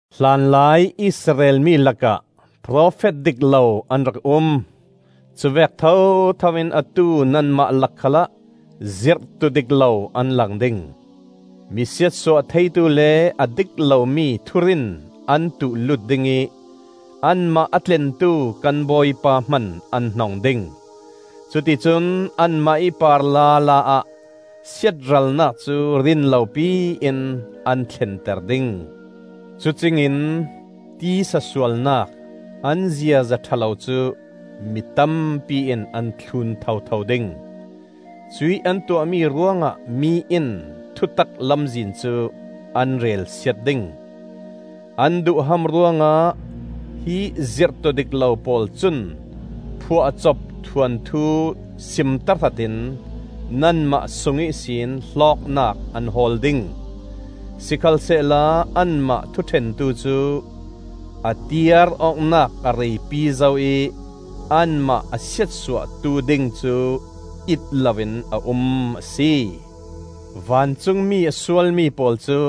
Hlanlai Israel mi lakah profet dik lo an rak um; cu vek thothoin atu nanmah lak khalah zirhtu dik lo an lang ding. Mi siatsuah theitu le a dik lomi thurin an tuh-lut dingih anmah a tlentu kan Bawipa hman an hnong ding; cuticun anmah ih par lala ah siatralnak cu rinlopi in an thlenter ding. Cucingin tisa sualnak an ziaza ṭha lo cu mi tampi in an thlun thotho ding; cuih an tuahmi ruangah mi in thutak Lamzin cu an relsiat ding. An duhham ruangah hi zirhtu dik lo pawl cun phuahcop thuanthu sim tahratin nanmah sung ihsin hlawknak an hawl ding. Sikhalsehla anmah Thuṭhentu cu a tiar awknak a reipi zo ih anmah a Siatsuahtu ding cu it loin a um a si. Vancungmi a sualmi pawl cu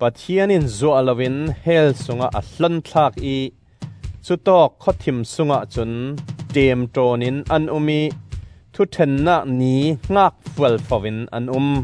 Pathian in zuah loin hell sungah a hlonthlak ih cutawk khawthim sungah cun ṭemṭawnin an um ih Thuṭhennak Ni hngak fualfo in an um.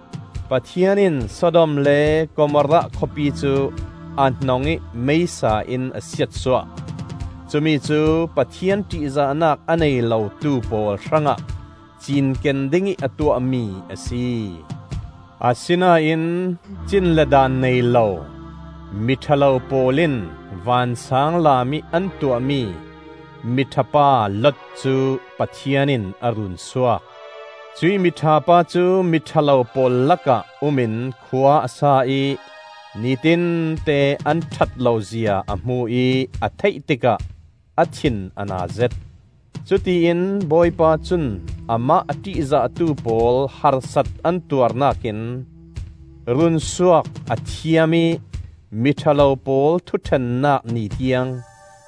Pathian in Sodom le Gomorrah khawpi cu a hnong ih meisa in a siatsuah; cumi cu Pathian ṭihzahnak a nei lotu pawl hrangah cinken dingih a tuahmi a si. Asinain cin le daan nei lo, miṭha lo pawl in vansaanglam ih an tuahmi miṭha pa Lot cu Pathian in a runsuak. Cuih miṭha pa cu miṭha lo pawl lakah um in khua a sa ih nitinte an ṭhat lo zia a hmu ih a theih tikah a thin a na zet. Cutiin Bawipa cun amah a ṭihzahtu pawl harsat an tuarnak in runsuak a thiam ih miṭha lo pawl Thuṭhennak Ni tiang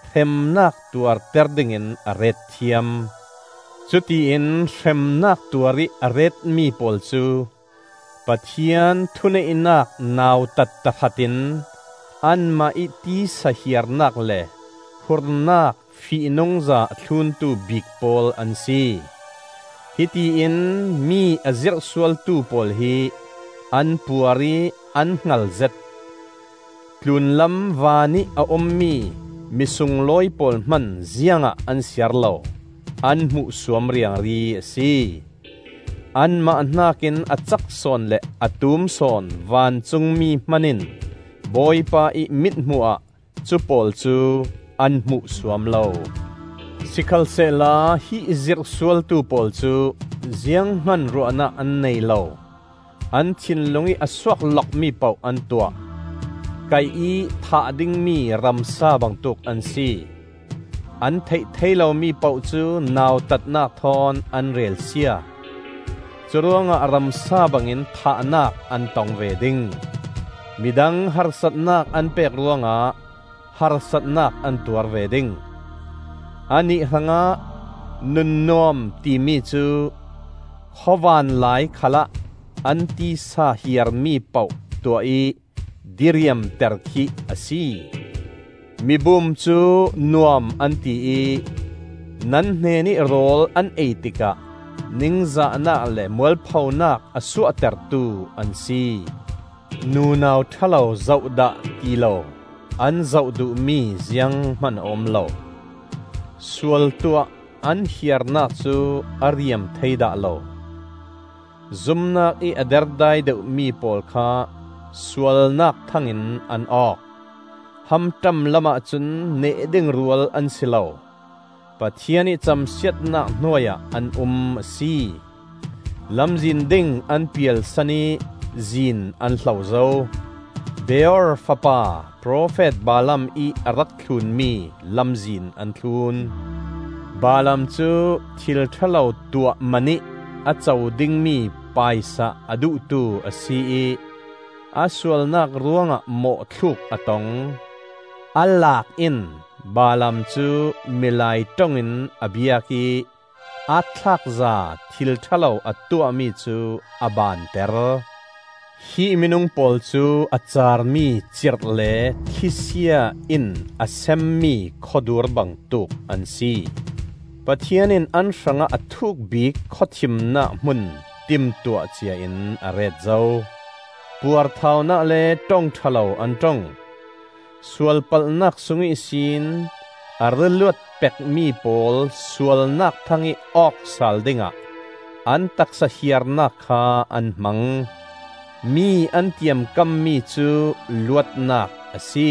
hremnak tuarter dingin a ret thiam. Cutiin hremnak tuarih a retmi pawl cu Pathian thuneihnak nautat tahratin anmah ih tisa hiarnak le hurnak fihnungza a thluntu bik pawl an si. Hitiin mi a zirhsualtu pawl hi an puar ih an hngalzet; tlunlam vanih a ummi misunglawi pawl hman ziangah an siar lo; an hmuhsuam riangri a si. Anmah hnakin a cak sawn le a tumsawn vancungmi hmanin Bawipa ih mithmuh ah cu pawl cu an hmuhsuam lo. Sikhalsehla hi zirhsualtu pawl cu ziang hman ruahnak an nei lo, an thinlung ih a suak lokmi poh an tuah; kaih-ih thah dingmi ramsa bangtuk an si. An theih thei lomi poh cu nautatnak thawn an relsia. Curuangah ramsa bangin thahnak an tong ve ding. Midang harsatnak an pek ruangah harsatnak an tuar ve ding. Annih hrangah nun nuam timi cu khawvan lai khalah an tisa hiarmi poh tuah ih diriamter khi a si. Mi bum cu nuam an ti ih nan hnenih rawl an ei tikah ningzahnak le mualphonak a suahtertu an si. Nunau ṭha lo zoh dah ti lo an zoh duhmi ziang hman a um lo; sual tuah an hiarnak cu a riam thei dah lo. Zumnakih a derdai deuhmi pawl kha sualnak thang in an awk. Hamṭam lamah cun neh ding rual an si lo. Pathian ih camsiatnak hnuai ah an um a si. Lamzin ding an pialsan ih zin an hlo zo. Beor fapa profet Balaam ih a rak thlunmi lamzin an thlun. Balaam cu thil ṭha lo tuah man ih a co dingmi paisa a duhtu a si ih, a sualnak ruangah mawhthluk a tong. A laak in Balaam cu milai ṭong in a biak ih aatthlakza thil ṭha lo a tuahmi cu a baanter. Hi minung pawl cu a caarmi cirh le thlisia in a semmi khawdur bangtuk an si. Pathian in an hrangah a thuk bik khawthimnak hmun timtuah ciain a ret zo. Puarthaunak le ṭong ṭha lo an ṭong; sualpalhnak sung ihsin a ra luat pekmi pawl sualnak thang-ih awk sal dingah an taksa hiarnak kha an hmang. Mi an tiamkammi cu luatnak a si,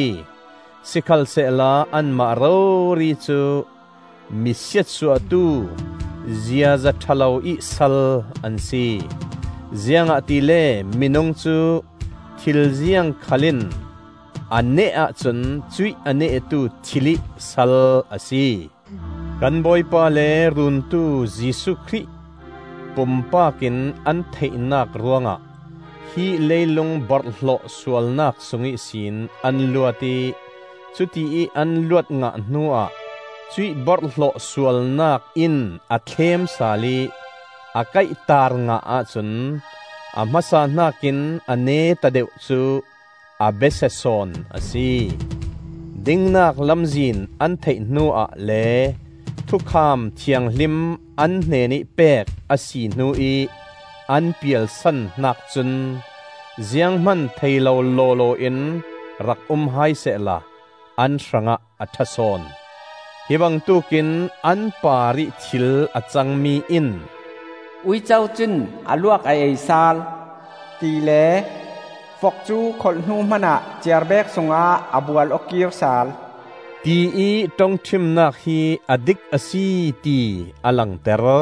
sikhalsehla anmah rori cu mi siatsuahtu ziaza ṭha lo ih sal an si; ziangahtile minung cu thil ziang khal in a neh ahcun cuih a nehtu thil ih sal a si. Kan Bawipa le Runtu Jesuh Khrih pumpak in an theihnak ruangah hi leilung borhhlawh sualnak sung ihsin an luat ih cutiih an luat ngah hnuah cuih borhhlawh sualnak in a thlem sal ih a kaihtaar ngah ahcun a hmasa hnakin a neta deuh cu a besia sawn a si. Dingnak lamzin an theih hnuah le thukham thianghlim an hnenih pek a si hnu ih an pialsan hnak cun ziang hman thei lo lawlaw in rak um hai sehla an hrangah a ṭha sawn. Hi bangtuk in an parih thil a cangmi in, “Uico cun a luak a ei sal,” tile, “Vok cu kholh hnu hmanah ciarbek sungah a bual aw kiir sal,” tiih ṭongṭhimnak hi a dik a si ti a langter.